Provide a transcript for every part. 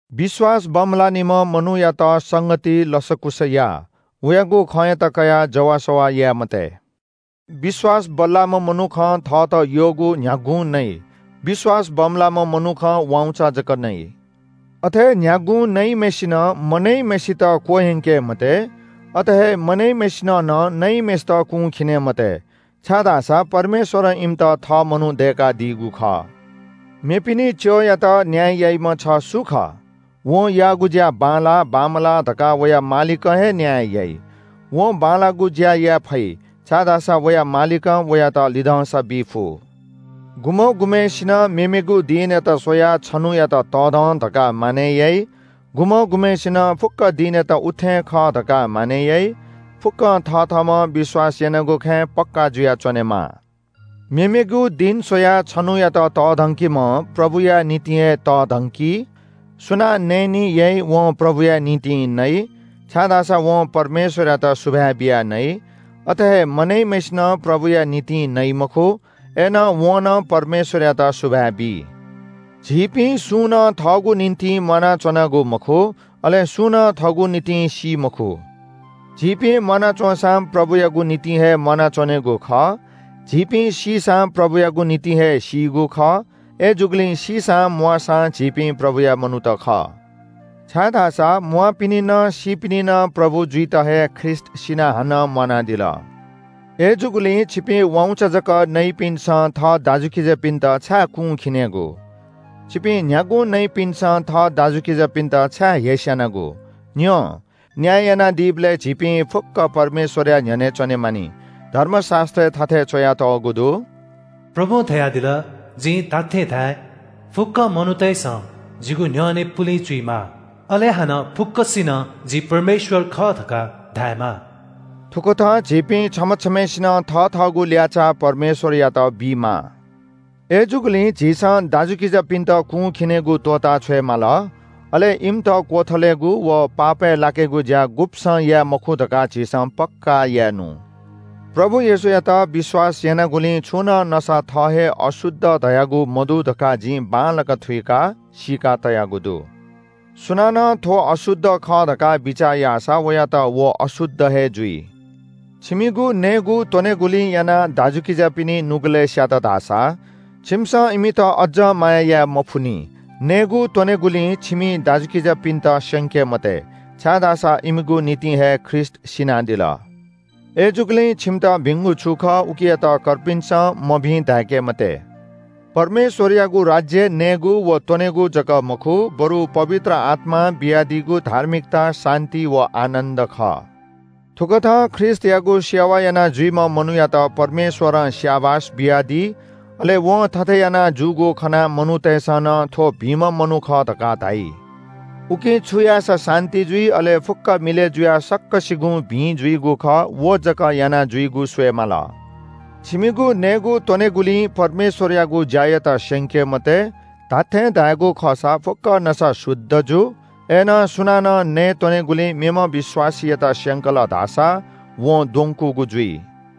विश्‍वास बमलाःनिम्‍ह मनूयात संगतिइ लसकुस या, वयागु खँयात कयाः जवाःसवाः याये मते। विश्‍वास बल्‍लाःम्‍ह मनुखं थःत यःगु न्‍ह्यागुं नइ, विश्‍वास बमलाःम्‍ह मनुखं वाउँचा जक नइ। अथे न्‍ह्यागुं नइम्‍हय्‌सिनं मनइम्‍हय्‌सित क्‍वह्यंके मते, अथे हे मनइम्‍हय्‌सिनं नं नइम्‍हय्‌सित कुंखिने मते। छाय्‌धाःसा परमेश्‍वरं इमित थः मनू दय्‌कादीगु खः। मेपिनि च्‍यःयात न्‍याय याइम्‍ह छ सु खः? वं याःगु ज्‍या बांलाः बांमलाः धकाः वया मालिकं हे न्‍याय याइ। वं बांलाःगु ज्‍या याये फइ, छाय्‌धाःसा वया मालिकं वयात लिधंसा बी फु। गुम्‍ह गुम्‍हय्‌सिनं मेमेगु दिनयात स्‍वयाः छन्‍हुयात तःधं धकाः मानय् याइ। गुम्‍ह गुम्‍हय्‌सिनं फुक्‍क दिनयात उत्‍थें खः धकाः मानय् याइ। फुक्‍कं थथःम्‍हं विश्‍वास यानागु खँय् पक्‍का जुयाच्‍वनेमाः। मेमेगु दिं स्‍वयाः छन्‍हुयात तःधंकीम्‍हं प्रभुया निंतिं हे तःधंकी। सुनां नयेनी याइ वं प्रभुया निंतिं नइ, छाय्‌धाःसा वं परमेश्‍वरयात सुभाय् बियाः नइ। अथे हे मनइम्‍हय्‌सिनं प्रभुया निंतिं नइ मखु, अय्‌नं वं नं परमेश्‍वरयात सुभाय् बी। झीपिं सुं नं थःगु निंतिं म्‍वानाच्‍वनागु मखु। अले सुं नं थःगु निंतिं सी मखु। झीपिं म्‍वाना च्‍वंसा प्रभुयागु निंतिं हे म्‍वानाच्‍वनेगु खः। झीपिं सीसां प्रभुयागु निंतिं हे सीगु खः। अय्‌जूगुलिं सीसां म्‍वाःसां झीपिं प्रभुया मनूत खः। छाय्‌धाःसा म्‍वाःपिनि नं सीपिनि नं प्रभु जुइत हे ख्रीष्‍ट सिनाः हानं म्‍वानादिल। अय्‌जूगुलिं छिपिं वाउँचा जक नइपिन्‍सं थः दाजुकिजापिन्‍त छाय् कुंखिनेगु? छिपिं न्‍ह्यागुं नइपिन्‍सं थः दाजुकिजापिन्‍त छाय् हेस्‍यानागु? न्‍यँ, न्‍याय यानादीबलय् झीपिं फुक्‍कं परमेश्‍वरया न्‍ह्यःने च्‍वने मानि। धर्मशास्‍त्रय् थथे च्‍वयातःगु दु – “प्रभुं धयादिल – जिं धात्‍थें धाये – फुक्‍क मनूतय्‌सं जिगु न्‍ह्यःने पुलिं चुइमाः। अले हानं फुक्‍कसिनं जि परमेश्‍वर खः धकाः धायेमाः।” थुकथं झीपिं छम्‍ह छम्‍हय्‌सिनं थथःगु ल्‍याःचाः परमेश्‍वरयात बीमाः। अय्‌जूगुलिं झीसं दाजुकिजापिन्‍त कुंखिनेगु त्‍वःताछ्वये माल, अले इमित क्‍वथलेगु व पापय् लाकेगु ज्‍या गुब्‍सं याये मखु धकाः झीसं पक्‍का याये नु। प्रभु येशूयात विश्‍वास यानागुलिं छुं नं नसा थः हे अशुद्ध धयागु मदु धकाः जिं बांलाक थुइकाः सीका तयागु दु। सुनानं थ्‍व अशुद्ध खः धकाः बिचाः याःसा वयात व अशुद्ध हे जुइ। छिमिगु नयेत्‍वनेगुलिं यानाः दाजुकिजापिनि नुगलय् स्‍यात धाःसा छिमिसं इमित अज्‍जं माया याये मफुनि। नयेत्‍वनेगुलिं छिमि दाजुकिजापिन्‍त स्‍यंके मते, छाय्‌धाःसा इमिगु निंतिं हे ख्रीष्‍ट सिनादिल। अय्‌जूगुलिं छिमित भिंगु छु खः उकियात कर्पिन्‍सं मभिं धाय्‌के मते। परमेश्‍वरयागु राज्‍य नयेगु व त्‍वनेगु जक मखु, बरु पवित्र आत्‍मां बियादीगु धार्मिकता, शान्‍ति व आनन्‍द खः। थुकथं ख्रीष्‍टयागु सेवा यानाजुइम्‍ह मनूयात परमेश्‍वरं स्‍याबास बियादी, अले वं थथे याना जूगु खनाः मनूतय्‌सं नं थ्‍व भिंम्‍ह मनू खः धकाः धाइ। उकिं छु याःसा शान्‍ति जुइ, अले फुक्‍क मिलय् जुयाः सकसिगुं भिं जुइगु खः, व जक यानाजुइगु स्‍वये माल। छिमिगु नयेत्‍वनेगुलिं परमेश्‍वरयागु ज्‍यायात स्‍यंके मते। धात्‍थें धायेगु खःसा फुक्‍क नसा शुद्ध जू, अय्‌नं सुनानं नयेत्‍वनेगुलिं मेम्‍ह विश्‍वासीयात स्‍यंकल धाःसा वं द्वंकूगु जुइ।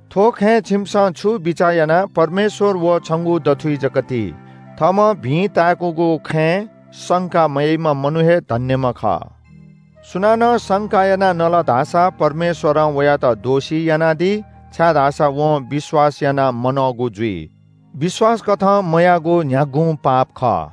थ्‍व खँय् छिमिसं छु बिचाः यानाः परमेश्‍वर व छंगु दथुइ जक ति। थःम्‍हं भिं ताय्‌कूगु खँय् संका मयाइम्‍ह मनू हे धन्‍यम्‍ह खः। सुनानं संका यानाः नल धाःसा परमेश्‍वरं वयात दोषी यानादी, छाय्‌धाःसा वं विश्‍वास यानाः मनःगु जुइ। विश्‍वासकथं मयाःगु न्‍ह्यागुं पाप खः।